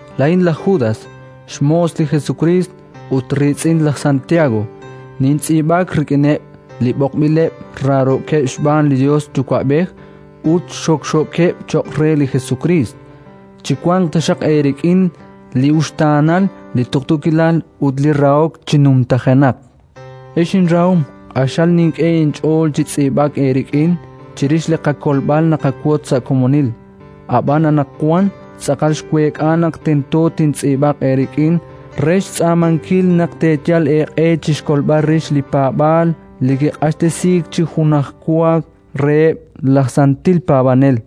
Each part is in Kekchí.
Laa'in laj Judas, xmoos li Jesukriist ut riitz'in laj Santiago, nintz'iib'ak rik'ineb' li b'oqb'ileb', raarookeb' xb'aan li Yos Yuwa'b'ej ut xokxookeb' cho'q re li Jesukriist. Chiwanq taxaq eerik'in li uxtaanal, li tuqtuukilal ut li rahok chi numtajenaq. Ex inrahom, q'axal xink'e inch'ool chi tz'iib'ak eerik'in chirix li qakolb'al naqawotz sa' komonil; ab'an anaqwan tz'aqal xweek'a naq tento tintz'iib'aq eerik'in re xtz'aamankil naq teeyal eeq'e chi xkolb'al rix li paab'aal li kiq'axtesiik chi junwaakaj reheb' laj santil paab'anel.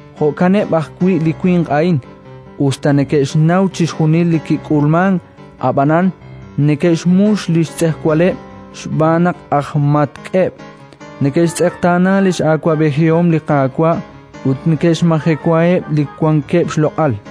Jo'kaneb' ajwi' li winq a'in: us ta neke'xnaw chixjunil li kik'ulmank, ab'anan neke'xmux li xtz'ejwaleb', xb'aan naq aj matk'eb'; neke'xtz'eqtaana li x'awab'ejihom li Qaawa' ut neke'xmajewaheb' li wankeb' xloq'al.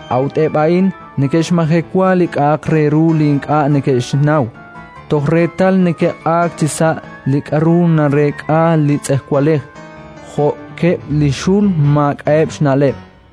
A'ut eb' a'in neke'xmajewa li k'a'aq re ru li ink'a' neke'xnaw, toj reetal neke'q'aak chisa' li k'aru nareek'a li tz'ejwalej, jo'keb' li xul maak'a'eb' xna'leb'.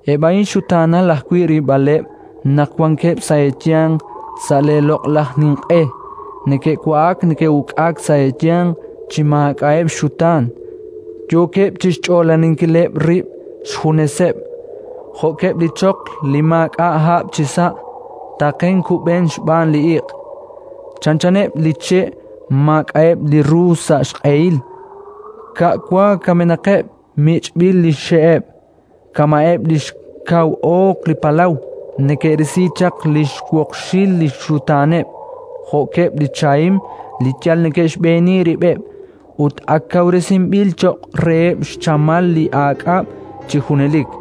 Eb' a'in xutaanal ajwi' rilb'aleb' naq wankeb' sa' eeyanq sa' leeloq'laj ninq'e: neke'wa'ak neke'uk'ak sa' eeyanq chi maak'a'eb' xxutaan, yookeb' chi xch'oolaninkileb' rib' xjuneseb'. Jo'keb' li choql li maak'a' hab' chisa', taqen kub'eneb' xb'aan li iq', chanchaneb' li che' maak'a'eb' li ru sa' xq'ehil, ka' wa kamenaqeb', mich'b'il li xxe'eb'; kama'eb' li xkaw oq li palaw, neke'risi chaq li xwoqxil li xxutaaneb', jo'keb' li chahim li yal neke'xb'eeni rib'eb', ut ak kawresinb'il cho'q reheb' xchamal li aak'ab' chi junelik.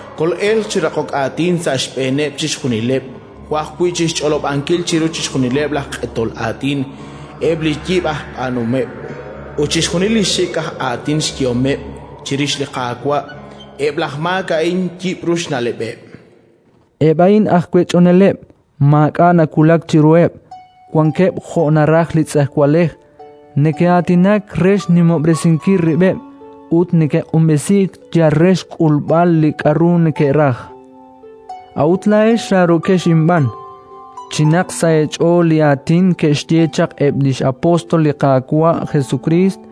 Kol'elq chi raqok aatin sa' xb'eeneb' chixjunileb' jo' ajwi' chi xch'olob'ankil chiru chixjunileb' laj q'etol aatin eb' li xyib' aj b'aanuhomeb' ut chixjunil li xik' aj aatin xyehomeb' chirix li Qaawa' eb' laj maak a'in yib'ru xna'leb'eb'”. Eb' a'in aj wech'oneleb', maak'a' nawulak chiruheb'; wankeb' jo' naraj li tz'ejwalej. Neke'aatinak re xnimob'resinkil rib'eb' ut neke'q'unb'esink yal re xk'ulb'al li k'aru neke'raj. A'ut laa'ex raarookex inb'aan, chinaq sa' eech'ool li aatin ke'xye chaq eb' li x'apóstol li Qaawa' Jesukriist: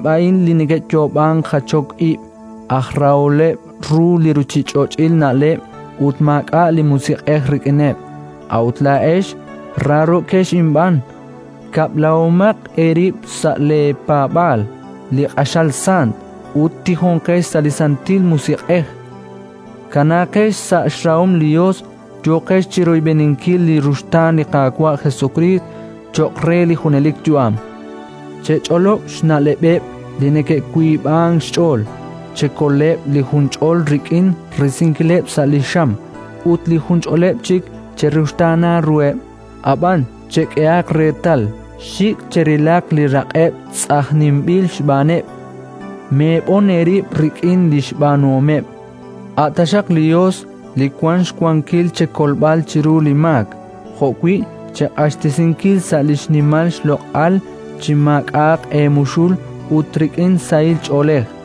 A'aneb' a'in li neke'yoob'ank jachok ib', aj raholeb' ru li ruuchich'och'il na'leb', ut maak'a' li Musiq'ej rik'ineb'. A'ut laa'ex raarookex inb'aan, kab'lahomaq eerib' sa' leepaab'aal li q'axal sant, ut tijonqex sa' li Santil Musiq'ej. Kanaaqex sa' xrahom li Yos, yooqex chi royb'eninkil li ruxtaan li Qaawa' Jesukriist, cho'q re li junelik yu'am. Chech'olob' xna'leb'eb' li neke'wiib'ank xch'ool. Chekoleb' li junch'ol rik'in risinkileb' sa' li xam, ut li junch'oleb' chik cheruxtaana ruheb'; ab'an chek'ehaq reetal: xik' cherilaq li raq'eb' tz'ajninb'il xb'aaneb', meeb'on eerib' rik'in li xb'aanuhomeb'. A' taxaq li Yos li wank xwankil chekolb'al chiru li maak jo'wi' cheq'axtesinkil sa' li xnimal xloq'al chi maak'a'aq eemuxul ut rik'in sahil ch'oolej,